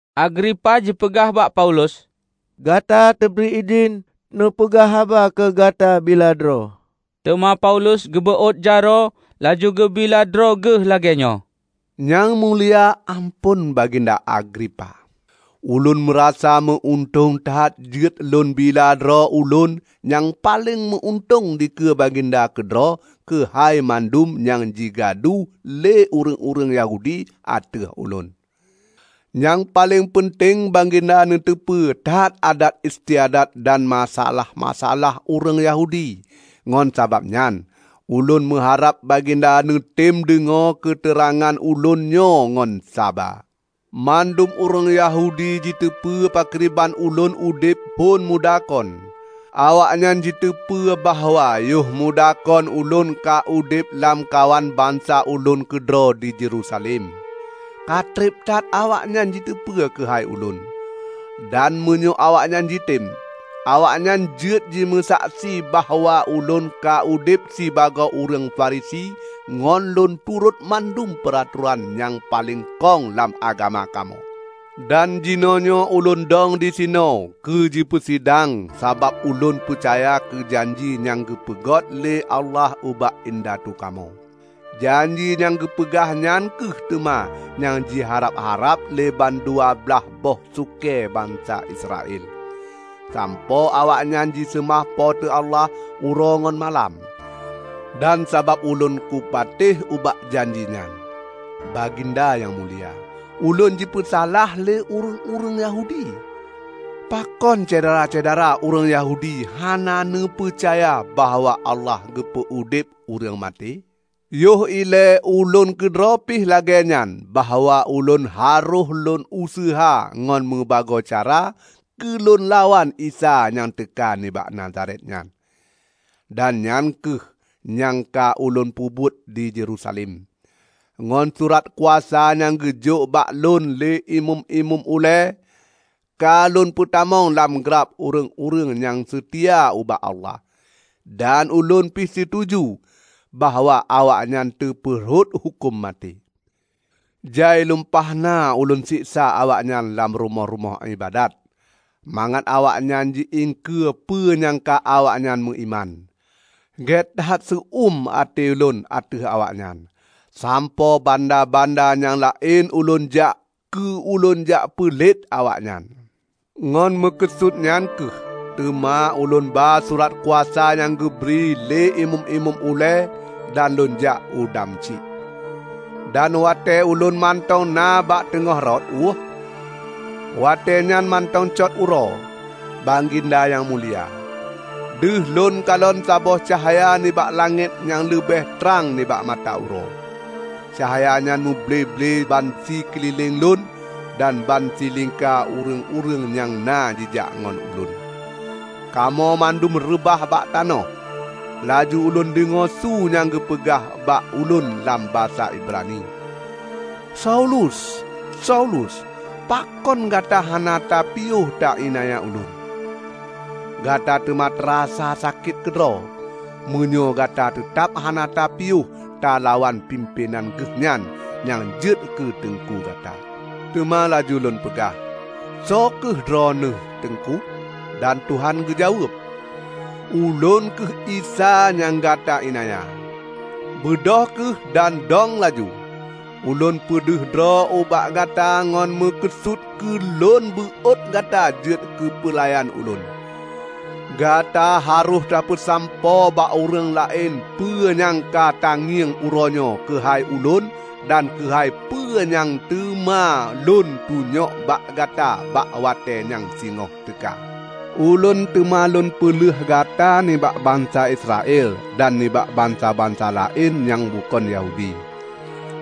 Agripa jipeugah bak Paulus, "Gata teubri idhin neupeugah haba keu gata bila droe." Teuma Paulus geubeuôt jaroe laju geubila droe geuh lagée nyoe, "Nyang Mulia Amphon Baginda Agripa! Ulôn meurasa meu-untông that jeuet lôn bila droe ulôn nyang paleng meu-untông dikeue Baginda keudroe keuhai mandum nyang ji gadu lé ureuëng-ureuëng Yahudi ateueh ulôn; nyang paleng peunteng Baginda neuteupeue that adat istiadat dan masa-alah-masa-alah ureuëng Yahudi. Ngon sabab nyan, ulôn meuharab Baginda neutem deungoe keuteurangan ulôn nyoe ngon saba. Mandum ureuëng Yahudi jiteupeu pakriban ulôn udeb phon muda kon. Awaknyan jiteupeu bahwa yohmuda kon ulôn ka udeb lamkawan bansa ulôn keudroe di Yerusalem. Katreb that awaknyan jiteupeue keuhai ulôn. Dan meunyoe awaknyan jitem, awaknyan jeuet jimeusaksi bahwa ulôn ka udeb sibagoe ureuëng Farisi ngon lôn turot mandum peuratoran nyang paleng kong lam agama kamoe. Dan jinoenyoe ulôn dong disinoe keu jipeusidang sabab ulôn peucaya keu janji nyang geupeugot lé Allah ubak indatu kamoe. Janji nyang geupeugah nyan kheueh teuma nyang jiharab-harab lé bandua blaih boh sukée bansa Israel, sampoe awaknyan jiseumah Po teu Allah uroe ngon malam. Dan sabab ulôn kupatéh ubak janji nyan, Baginda nyang mulia, ulôn jipeusalah lé ureuëng-ureuëng Yahudi. Pakon syedara-syedara ureuëng Yahudi hana neupeucaya bahwa Allah geupeu udeb ureuëng maté? Yoh ilée ulôn keudroe pih lagée nyan bahwa ulôn harôh lôn useuha ngon meubagoe cara keu lôn lawan Isa nyang teuka nibak Nazaret nyan. Dan nyang kheueh nyang ka ulôn peubuet di Yerusalem. Ngon surat kuasa nyang geujok bak lôn lé Imeum-imeum ulée, ka lôn peutamong lam glab ureuëng-ureuëng nyang seutia ubak Allah. Dan ulôn pih situju bahwa awaknyan teupeu rhot huköm maté. Jai lumpah na ulôn seksa awaknyan lam rumoh-rumoh iébadat, mangat awaknyan ji iengkeue peue nyang ka awaknyan meuiman. Gét that seu eum até ulôn ateueh awaknyan, sampoe banda-banda nyang laén ulôn jak keu lôn jak peulet awaknyan." "Ngon meukeusut nyan kheueh teuma ulôn ba surat kuasa nyang geubri lé imeum-imeum ulée dan lôn jak u Damsyik. Dan watée ulôn mantong na bak teungoh rot euh, watée nyan mantong cot uroe, Baginda Nyang Mulia, deuh lôn kalon saboh cahya nibak langét nyang leubeh trang nibak mata uroe. Cahya nyan meuble-ble ban sikeulileng lôn dan ban silingka ureuëng-ureuëng nyang na jijak ngon ulôn. Kamoe mandum reubah bak tanoh. Laju ulôn deungoe su nyang geupeugah bak ulôn lam basa Ibrani, 'Saulus, Saulus! Pakon gata hana tapiôh ta iénanya Ulôn? Gata teuma tarasa sakét keudroe, meunyoe gata teutab hana tapiôh talawan pimpén Geuhnyan nyang jeuet keu teungku gata.' Teuma laju lôn peugah, 'Soe kheueh Droeneueh, Teungku?' Dan Tuhan geujaweueb, 'Ulôn kheueh Isa nyang gata iénanya. Beudôh kheueh dan dong laju! Ulôn peudeh droe ubak gata ngon meukeusut keu Lôn beuot gata jeuet keupeulayan Ulôn. Gata harôh tapeusampoe bak ureuëng laén peue nyang ka ta ngieng uroenyoe keuhai Ulôn dan keuhai peue nyang teuma Lôn tunyok bak gata bak watée nyang singoh teuka. Ulôn teuma Lôn peulheueh gata nibak bansa Israel dan nibak bansa-bansa laén nyang bukon Yahudi.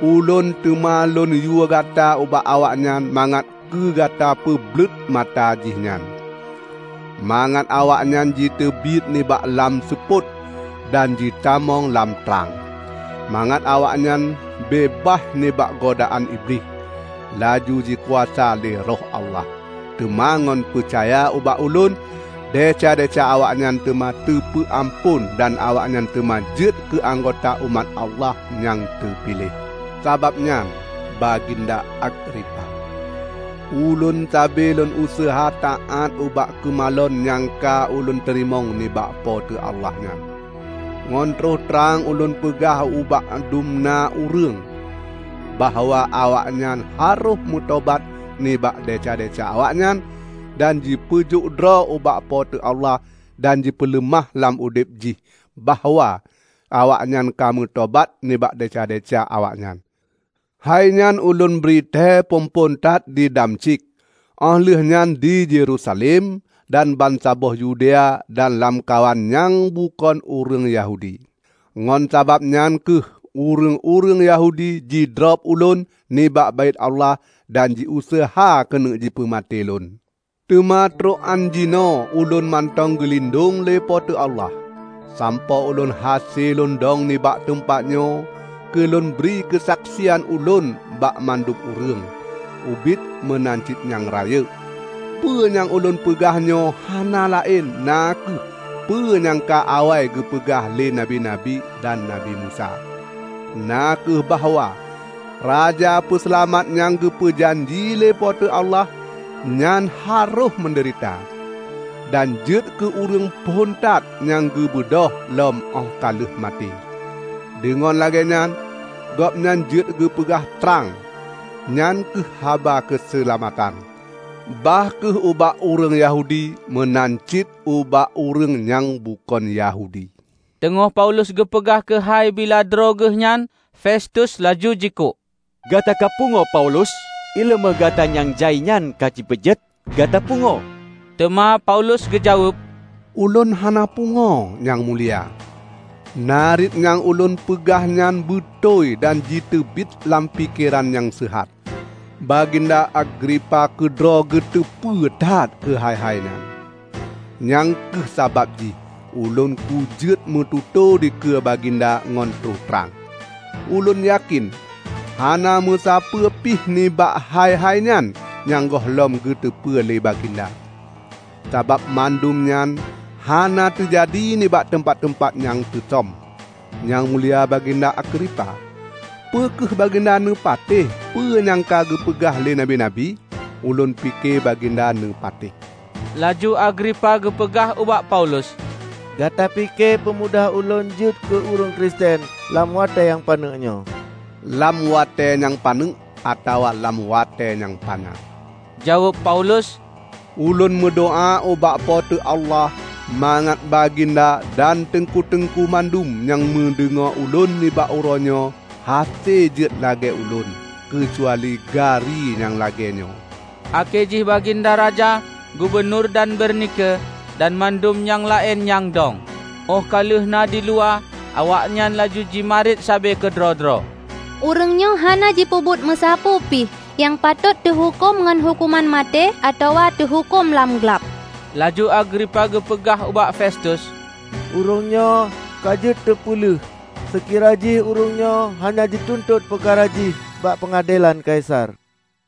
Ulôn teuma Lôn yue gata ubak awaknyan mangat keu gata peubleuet mata jihnyan, mangat awaknyan jiteubiet nibak lam seupôt dan jitamong lam trang; mangat awaknyan beubaih nibak godaan iblih, laju jikuasa lé Roh Allah. Teuma ngon peucaya ubak Ulôn desya-desya awaknyan teuma teupeu amphon dan awaknyan teuma jeuet keu anggota umat Allah nyang teupiléh.' " "Sabab nyan, Baginda Agripa, ulôn sabe lôn useuha taát ubak keumalon nyang ka ulôn teurimong nibak Po teu Allah nyan. Ngon troh trang ulôn peugah ubak dum na ureuëng bahwa awaknyan harôh meutobat nibak desya-desya awaknyan dan jipeujok droe ubak Po teu Allah dan jipeuleumah lam udeb jih bahwa awaknyan ka meutobat nibak desya-desya awaknyan. Hainyan ulôn bri tée phon-phon that di Damsyik, óh lheueh nyan di Yerusalem dan bansaboh Yudea dan lamkawan nyang bukon ureuëng Yahudi. Ngon sabab nyan kheueh ureuëng-ureuëng Yahudi jidrob ulôn nibak Baét Allah dan jiuseuha keuneuk peumaté lôn. Teuma trok án jinoe ulôn mantong geulindong lé Po teu Allah, sampoe ulôn hase lôndong nibak teumpat nyoe keu lôn bri keusaksian ulôn bak mandum ureuëng -- ubit meunan cit nyang rayeuk. Peue nyang ulôn peugahnyoe hana laén na kheueh peu nyang ka awai geupeugah lé nabi-nabi dan Nabi Musa; na kheueh bahwa Raja Peuseulamat nyang geupeu janji lé Po teu Allah nyan harôh meudeurita, dan jeuet keu ureuëng phon that nyang geubeudôh lom óh ka lheueh maté; deungon lagée nyan Gobnyan jeuet geupeugah trang -- nyan kheueh haba keuseulamatan -- bah kheueh ubak ureuëng Yahudi meunan cit ubak ureuëng nyang bukon Yahudi." Teungoh Paulus geupeugah keuhai bila droe geuhnyan, Festus laju jikuk, "Gata ka pungoe Paulus! Iéleumé gata nyang jai nyan ka jipeujeuet gata pungoe!" Teuma Paulus geujaweueb, "Ulôn hana pungoe, Nyang Mulia. Nariet nyang ulôn peugah nyan beutôi dan jiteubiet lam pikeran nyang seuhat. Baginda Agripa keudroe geuteupeue that keuhai-hai nyan, nyang kheueh sabab jih ulôn kujeuet meututoe dikeue Baginda ngon troh trang. Ulôn yakén hana musapeue pih nibak hai-hainyan nyang gohlom geuteupeue lé Baginda, sabab mandum nyan hana teujadi nibak teumpat-teumpat nyang teusom. Nyang Mulia Baginda Agripa, peu kheueh Baginda neupatéh peue nyang ka geupeugah lé nabi-nabi? Ulôn pike Baginda neupatéh!" Laju Agripa geupeugah ubak Paulus, "Gata pike peumudah ulôn jeuet keu ureuëng Kristen lam watée nyang paneuk nyoe?" "Lam watée nyang paneuk atawa lam watée nyang panyang," jaweueb Paulus, "Ulôn meudoá ubak Po teu Allah mangat Baginda dan Teungku-teungku mandum nyang neudeungoe ulôn nibak uroenyoe hase jeuet lagée ulôn -- keucuali gari nyang lagée nyoe!" Akhé jih baginda raja, gubunur dan Bernike, dan mandum nyang laén nyang dong. Óh ka lheueh na diluwa, awaknyan laju jimarit sabe keudroe-droe, "ureuëng nyoe hana jipeubuet meusapeue pih nyang patot teuhuköm ngon huköman maté atawa teuhuköm lam glab." Laju Agripa geupeugah ubak Festus, "Ureuëng nyoe ka jeuet teupeuleuh, seukira jih ureuëng nyoe hana jituntot peukara jih bak peungadelan Kaisar."